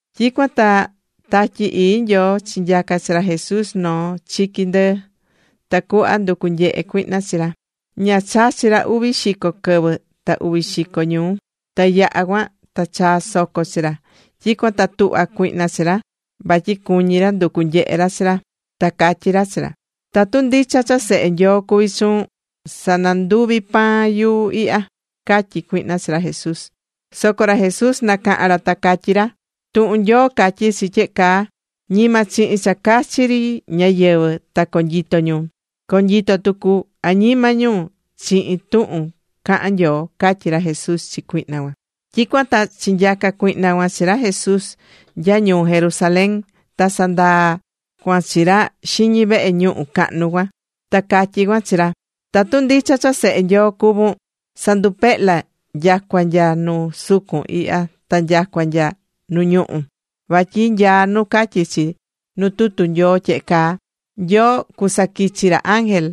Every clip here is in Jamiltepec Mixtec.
Tyicuan ta Tatyi Ii Nyoo chinyaca̱ chi ra Jesús noo chiqui ndɨɨ, tacuhva nducu nyehe cuihna chi ra. Ña chachi̱ ra uvi xico quɨvɨ ta uvi xico ñuu. Ta yaha̱ cuan ta chaa̱ soco chi ra. Tyicuan ta tuhva̱ cuihna chi ra, vatyi cuñí ra nducu nyehe ra chi ra. Ta catyí ra chi ra: ―Tatu ndicha cha Sehe Nyoo cuví chuun, sa̱nanduvi pan yuu ihya ―catyí cuihna chi ra Jesús. Soco ra Jesús nacaha̱n ra ta catyí ra: ―Tuhun Nyoo catyí chi tyehe caa: “Ñima chihin cha cachi ri ñáyɨvɨ ta conyito ñu. Conyito tucu añima ñu chihin tuhun cahán Nyoo” ―catyí ra Jesús chi cuihna cuan. Tyicuan ta chinyaca̱ cuihna cuan chi ra Jesús nya ñuu Jerusalén. Ta sandaa̱ cuan chi ra xiñi vehe ñuhu cahnu cuan. Ta catyí cuan chi ra: ―Tatu ndicha cha Sehe Nyoo cuvún, sa̱ndupehla nyacua nya nu sucun ihya ta nyacua nya nu ñuhú. Vatyi nyaá nu catyí chi nu tutu Nyoo tyehe caa: “Nyoo cusaquichi ra ángel,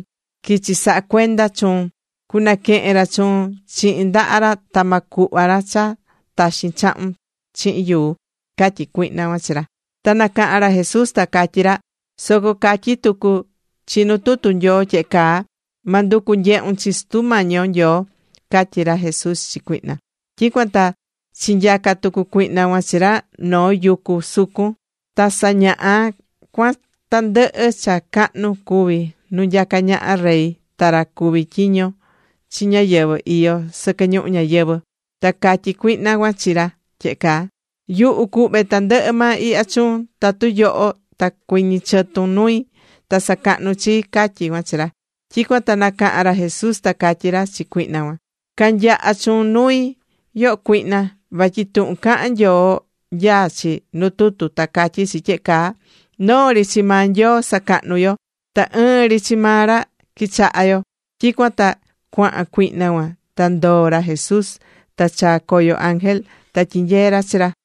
quichi saha cuenda chuun. Cunaquehen ra chuun chihin ndaha ra ta ma cuhva ra cha taxin chahun chihin yuu” ―catyí cuihna cuan chi ra. Ta nacaha̱n ra Jesús ta catyí ra: ―Soco catyí tucu chi nu tutu Nyoo tyehe caa: “Ma nducu nyehun chi Sutu Mañi yo Nyoo” ―catyí ra Jesús chi cuihna. Tyicuan ta chinyaca̱ tucu cuihna cuan chi ra noo yucu sucun. Ta sañaha̱ cuan tandɨhɨ cha cahnu cuví nu nyacá ñaha rey ta ra cuví tyiño chi ñáyɨvɨ iyó sɨquɨ ñuhu ñayɨvɨ̱. Ta catyí cuihna cuan chi ra tyehe caa: ―Yuhu cuhve tandɨhɨ maa ihya chuun, tatu yoho ta cuɨñɨ chɨtun nui ta sacahnun chii ―catyí cuan chi ra. Tyicuan ta nacaha̱n ra Jesús ta catyí ra chi cuihna cuan: ―Ca̱nyaha chuun nui, yoho cuihna. Vatyi tuhun cahán Nyoo nyaá chi nu tutu ta catyí chi tyehe caa: “Noo ri chi maa Nyoo sa̱cahnu yo. Ta ɨɨn ri chi maa ra qui̱chaha yo.” Tyicuan ta cuahan cuihna cuan, ta ndoo̱ ra Jesús, ta chaa̱ coyo ángel ta tyinyee̱ ra chi ra.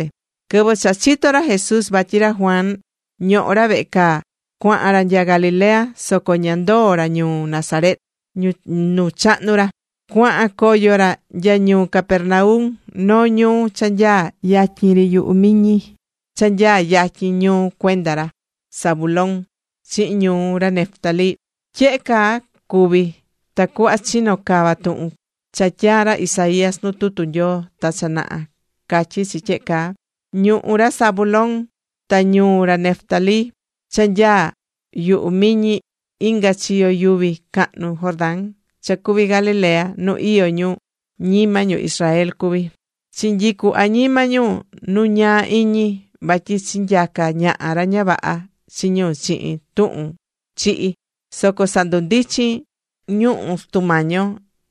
Quɨvɨ cha chito̱ ra Jesús vatyi ra Juan ñohó ra vehe caa, cuahan ra nya Galilea. Soco ña ndoo̱ ra ñuu Nazaret, nu chahnu̱ ra. Cuahan ra cua coo ra nya ñuu Capernaum, noo ñuu cha nyaá yatyin ri yuhu miñi, cha nyaá yatyin ñuhú cuenda ra Zabulón chihin ñuhú ra Neftalí. Tyehe caa cuvi̱ tacuhva chino cava tuhun cha tyaa̱ ra Isaías nu tutu Nyoo ta cha naha. Catyí chi tyehe caa: Ñuhú ra Zabulón ta ñuhú ra Neftalí cha nyaá yuhu miñi inga chiyo yuvi cahnu Jordán, cha cuví Galilea nu iyó ñu ñima ñu Israel cuví. Chinyicu̱ añima ñu nu ñaa iñi vatyi chinyaca̱ ñaha ra ña vaha chi ñu chihin tuhun chihi, soco sandundichín ñuhu̱ Sutu Mañi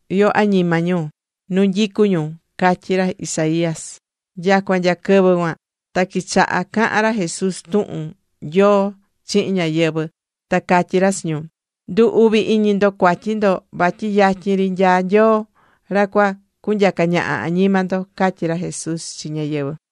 yo añima ñu nu nyicú ñu, catyí ra Isaías. Nyacua nya quɨvɨ cuan, ta quichaha cahan ra Jesús tuhun Nyoo chihin ñáyɨvɨ, ta catyí ra chi ñu: ―Ndu̱ uvi iñi ndo cuatyi ndo vatyi yatyin ri nyaá Nyoo ra cua cunyaca ñaha añima ndo ―catyí ra Jesús chi ñáyɨvɨ.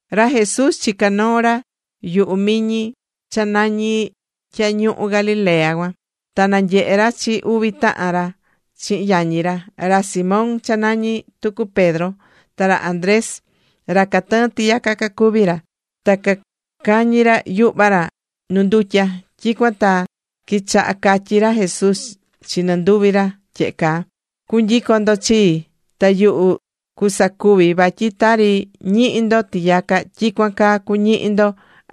Ra Jesús chicá noo ra yuhu miñi cha nañí Tyañuhu Galilea cuan. Ta nanyehe̱ ra chi uvi tahan ra chihin yañi ra, ra Simón cha nañí tucu Pedro, ta ra Andrés. Ra catɨɨ́n tiyaca cacuví ra. Ta cacañí ra yuhva ra nu ndutya. Tyicuan ta quichaha̱ catyi ra Jesús chi nɨnduvi ra tyehe caa: ―Cu̱nyicon ndo chii. Ta yuhu cusacuvi vatyi tari ñihí ndo tiyaca, tyicuan caa cuñihi ndo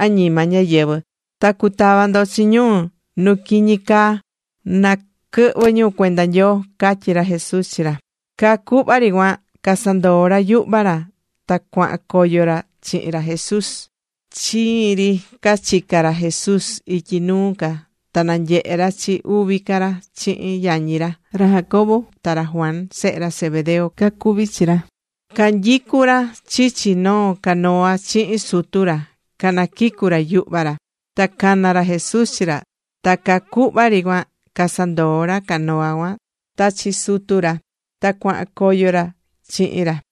anima ñáyɨvɨ (ta cutava ndo chi ñu nu quiñi caa na quɨhvɨ ñu cuenda Nyoo) ―catyí ra Jesús chi ra. Caa cuhva ri cuan casandoo̱ ra yuhva ra ta cuahan coyo ra chihin ra Jesús. Chiin ri ca chica̱ ra Jesús ityi nuu ca ta nanyehe̱ ra chi uvi ca ra chihin yañi ra, ra Jacobo ta ra Juan. Sehe ra Zebedeo cacuví chi ra. Canyicú ra chichi noo canoa chihin sutu ra canaquicú ra yuhva ra. Ta cana̱ ra Jesús chi ra. Ta caa cuhva ri cuan casandoo̱ ra canoa cuan ta chi sutu ra, ta cuahan coyo ra chihin ra.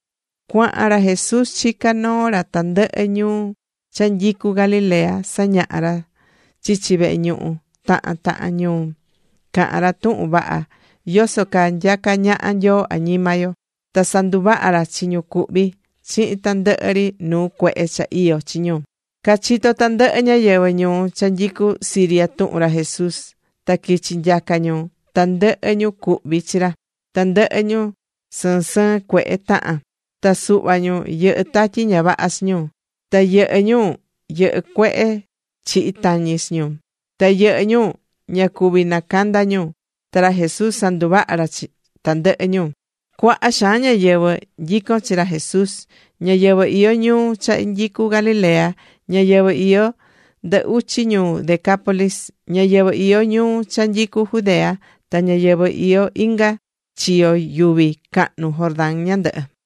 Cuahan ra Jesús chicá noo ra tandɨhɨ ñuu cha nyicú Galilea sañahá ra chichi vehe ñuhu tahan tahan ñuu. Cahán ra tuhun vaha yoso caa nyacá ñaha Nyoo añima yo. Ta sanduvaha̱ ra chi ñu cuhví chihin tandɨhɨ ri nuu cuehe cha iyó chi ñu. Cachitó tandɨhɨ ñáyɨvɨ ñuu cha nyicú Siria tuhun ra Jesús. Ta quichi̱ nyaca ñu tandɨhɨ ñu cuhví chi ra: tandɨhɨ ñu sɨɨn sɨɨn cuehe tahán. Ta suhva ñu yɨhɨ́ tatyi ña vaha chi ñu. Ta yɨhɨ́ ñu, yɨhɨ́ cuehe chihi tañi chi ñu. Ta yɨhɨ́ ñu ña cuví nacanda ñu. Ta ra Jesús sanduvaha̱ ra chi tandɨhɨ ñu. Cuaha xaan ñáyɨvɨ nyicón chi ra Jesús: ñáyɨvɨ iyó ñuu cha nyicú Galilea, ñáyɨvɨ iyó ndɨ uchi ñuu Decápolis, ñáyɨvɨ iyó ñuu cha nyicú Judea, ta ñáyɨvɨ iyó inga chiyo yuvi cahnu Jordán ñandɨhɨ.